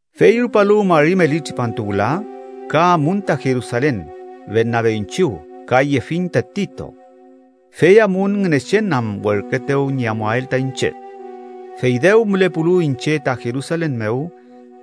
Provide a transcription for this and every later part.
Fey rupalu mari meli tripantu wüla, ka amun ta Jerusalen Bernabe iñchiw. Ka yefiñ ta Tito. Fey amun Ngünechen am werküetew ñi amuael ta iñche. Fey dew mülepulu iñche ta Jerusalen mew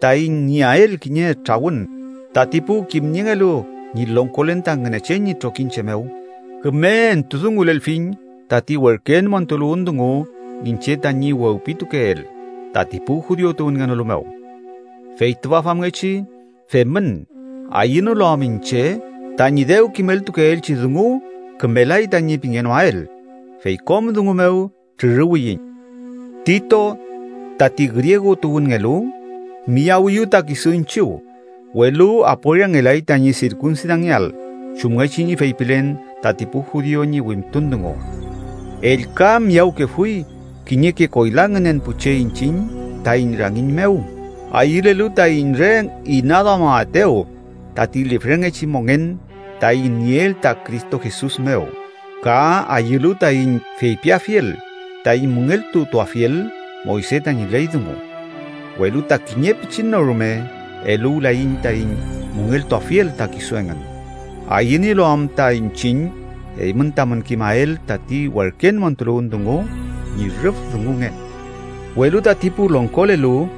taiñ nieael kiñe trawün tati pu kimniengelu ñi longkolen ta Ngünechen ñi trokiñche mew, küme entudungulelfiñ tati werken montuluwün dungu iñche tañi wewpitukeel tati pu judiu tuwünngenolu mew. Fey tüfa famngechi femün ayünolu am iñche tañi dew kimeltukeelchi dungu tañi kümelay tañi pingenoael, fey kom dungu mew trüruwiyiñ. Tito, tati griegu tuwünngelu, miyawiyu ta kisu iñchiw, welu aporiangelay tañi sirkunsidangeael chumngechi ñi feypilen tati pu judiu ñi wimtun dungu. Ellka miyawkefuy kiñeke koyla ngünen pu che iñchiñ taiñ rangiñ mew ayülelu taiñ re inaduamaetew tati lifrengechi mongen taiñ nieel ta Cristo Jesus mew ka ayülu taiñ feypiafiel taiñ müngeltutuafiel Moyse tañi ley dungu. Welu ta kiñe pichin no rume eluwlaiñ taiñ müngeltuafiel ta kisu engün, ayünielu am ta iñchiñ eymün tamün kimael tati werken montuluwün dungu ñi rüf dungungen. Welu tati pu longkolelu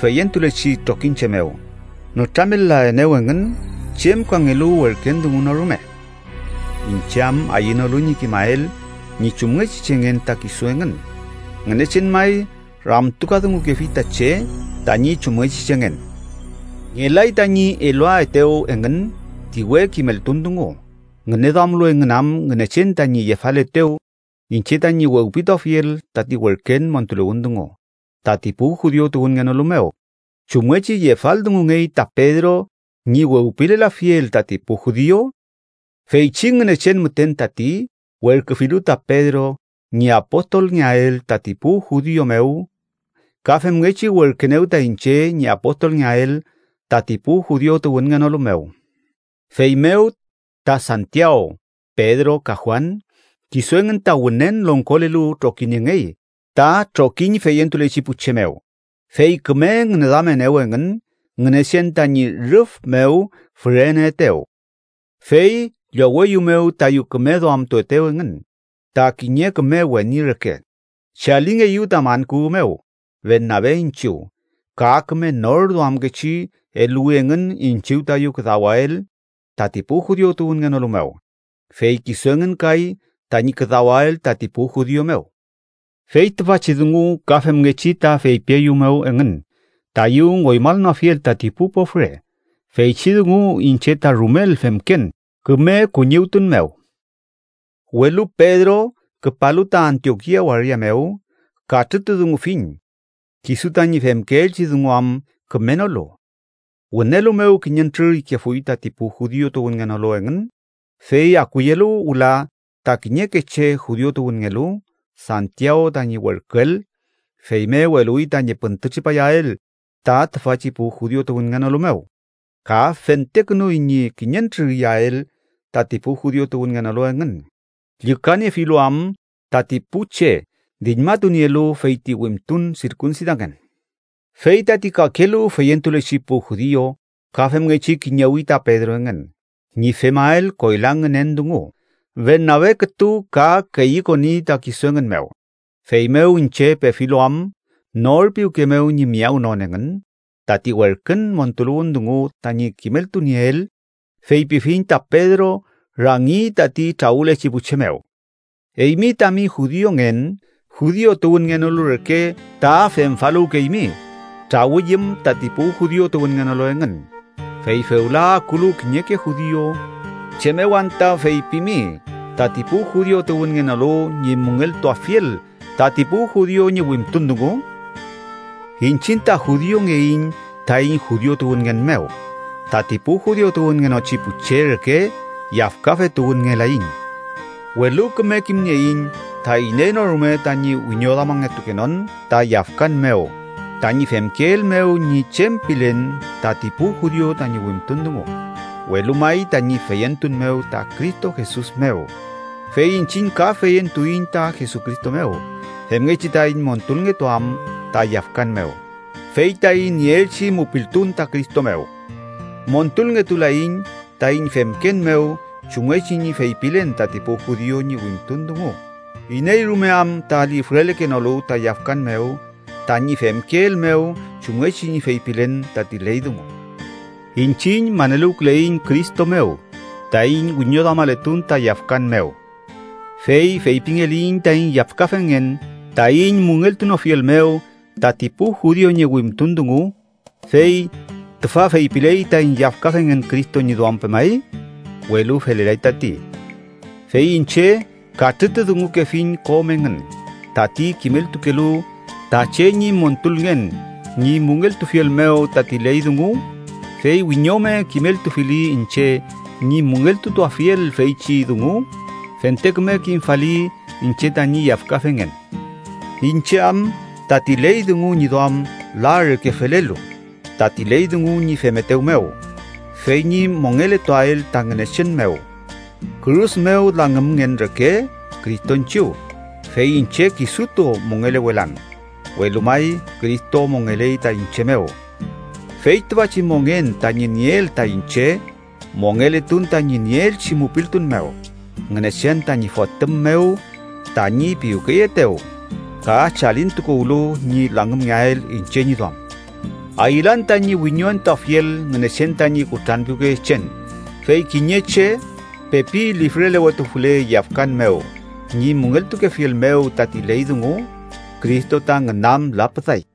feyentulechi trokiñche mew nütramel-laenew engün chem kangelu werken dungu no rume. (Iñche am ayünolu ñi kimael ñi chumngechi chengen ta kisu engün, Ngünechen may ramtukadungukefi ta che tañi chumngechi chengen.) Ngelay tañi eluaetew engün ti we kimeltun dungu, ngüneduamlu engün am Ngünechen tañi yefaletew iñche tañi wewpituafiel tati werken montuluwün dungu tati pu judiu tuwünngenolu mew, chumngechi yefaldungungey ta Pedro ñi wewpilelafiel tati pu judiu. Feychi Ngünechen müten tati werküfilu ta Pedro ñi apostolngeael tati pu judiu mew, ka femngechi werküenew ta iñche ñi apostolngeael tati pu judiu tuwünngenolu mew. Feymew, ta Santiaw, Pedro ka Juan, kisu engün ta wünen longkolelu trokiniengey ta trokiñ feyentulechi pu che mew, fey küme ngüneduamenew engün Ngünechen tañi rüf mew füreneetew. Fey lloweyumew tayu küme duamtuetew engün ta kiñe küme weni reke, chalingeyu ta man kuwü mew Bernabe iñchiw, ka küme nor duamkechi eluwi engün iñchiw tayu küdawael tati pu judiu tuwünngenolu mew, fey kisu engün kay tañi küdawael tati pu judiu mew. Fey tüfachi dungu ka femngechi ta feypieyumew engün, tayu ngoymanoafiel tati pu pofre, feychi dungu iñche ta rumel femken küme kuñiwtun mew. Welu Pedro küpalu ta Antiokia waria mew, katrütudungufiñ, kisu tañi femkeelchi dungu am kümenolu. Wünelu mew kiñentrür ikefuy tati pu judiu tuwünngenolu engün, fey akuyelu wüla ta kiñeke che judiu tuwünngelu Santiaw tañi werküel, feymew eluwi tañi püntütripayael ta tüfachi pu judiu tuwünngenolu mew, ka fentekünuy ñi kiñentrür iyael tati pu judiu tuwünngenolu engün, llükaniefilu am tati pu che diñmatunielu feyti wimtun sirkunsidangen. Fey tati kakelu feyentulechi pu judiu ka femngechi kiñewi ta Pedro engün ñi femael koyla ngünen dungu, Bernabe kütu ka keyükoni ta kisu engün mew. Feymew, iñche pefilu am nor piwke mew ñi miyawnon engün tati werkün montuluwün dungu tañi kimeltunieel, feypifiñ ta Pedro rangi tati trawülechi pu che mew: “Eymi, tami judiungen, judiu tuwünngenolu reke ta femfaluwkeymi trawüyüm tati pu judiu tuwünngenolu engün, fey fewla akulu kiñeke judiu, ¿chem mew anta feypimi tati pu judiu tuwünngenolu ñi müngeltuafiel tati pu judiu ñi wimtun dungu?” Iñchiñ ta judiungeiñ taiñ judiu tuwünngen mew, tati pu judiu tuwünngenochi pu che reke yafkafe tuwünngelaiñ. Welu küme kimnieiñ ta iney no rume tañi wiñoduamangetukenon ta yafkan mew tañi femkeel mew ñi chem pilen tati pu judiu tañi wimtun dungu, welu may tañi feyentun mew ta Cristo Jesus mew. Fey iñchiñ ka feyentuiñ ta Jesucristo mew, femngechi taiñ montulngetuam ta yafkan mew, fey taiñ nieelchi mupiltun ta Cristo mew. Montulngetulaiñ taiñ femken mew chumngechi ñi feypilen tati pu judiu ñi wimtun dungu, iney rume am ta lifrelekenolu ta yafkan mew tañi femkeel mew chumngechi ñi feypilen tati ley dungu. Iñchiñ maneluwküleiñ Cristo mew taiñ wiñoduamaletun ta yafkan mew. Fey feypingeliyiñ taiñ yafkafengen taiñ müngeltunofiel mew tati pu judiu ñi wimtun dungu, fey ¿tüfa feypiley taiñ yafkafengen Cristo ñi duam pemay? ¡Welu felelay tati! Fey iñche katrütudungukefiñ kom engün tati kimeltukelu ta che ñi montulngen ñi müngeltufiel mew tati ley dungu, fey wiñome kimeltufili iñche ñi müngeltutuafiel feychi dungu, fente küme kimfali iñche tañi yafkafengen. Iñche am tati ley dungu ñi duam la reke felelu tati ley dungu ñi femetew mew, fey ñi mongeletuael ta Ngünechen mew. Kürus mew langümngen reke Cristo iñchiw, fey iñche kisutu mongelewelan, welu may Cristo mongeley ta iñche mew. Fey tüfachi mongen tañi nieel ta iñche, mongeletun tañi nieelchi mupiltun mew Ngünechen tañi Fotüm mew tañi piwkeyeetew, ka chalintukuwlu ñi langümngeael iñche ñi duam. Ayülan tañi wiñoentuafiel Ngünechen tañi kutranpiwkeyechen, fey kiñe che pepi lifrelewetufule yafkan mew ñi müngeltukefiel mew tati ley dungu, Cristo ta ngünam lapüday.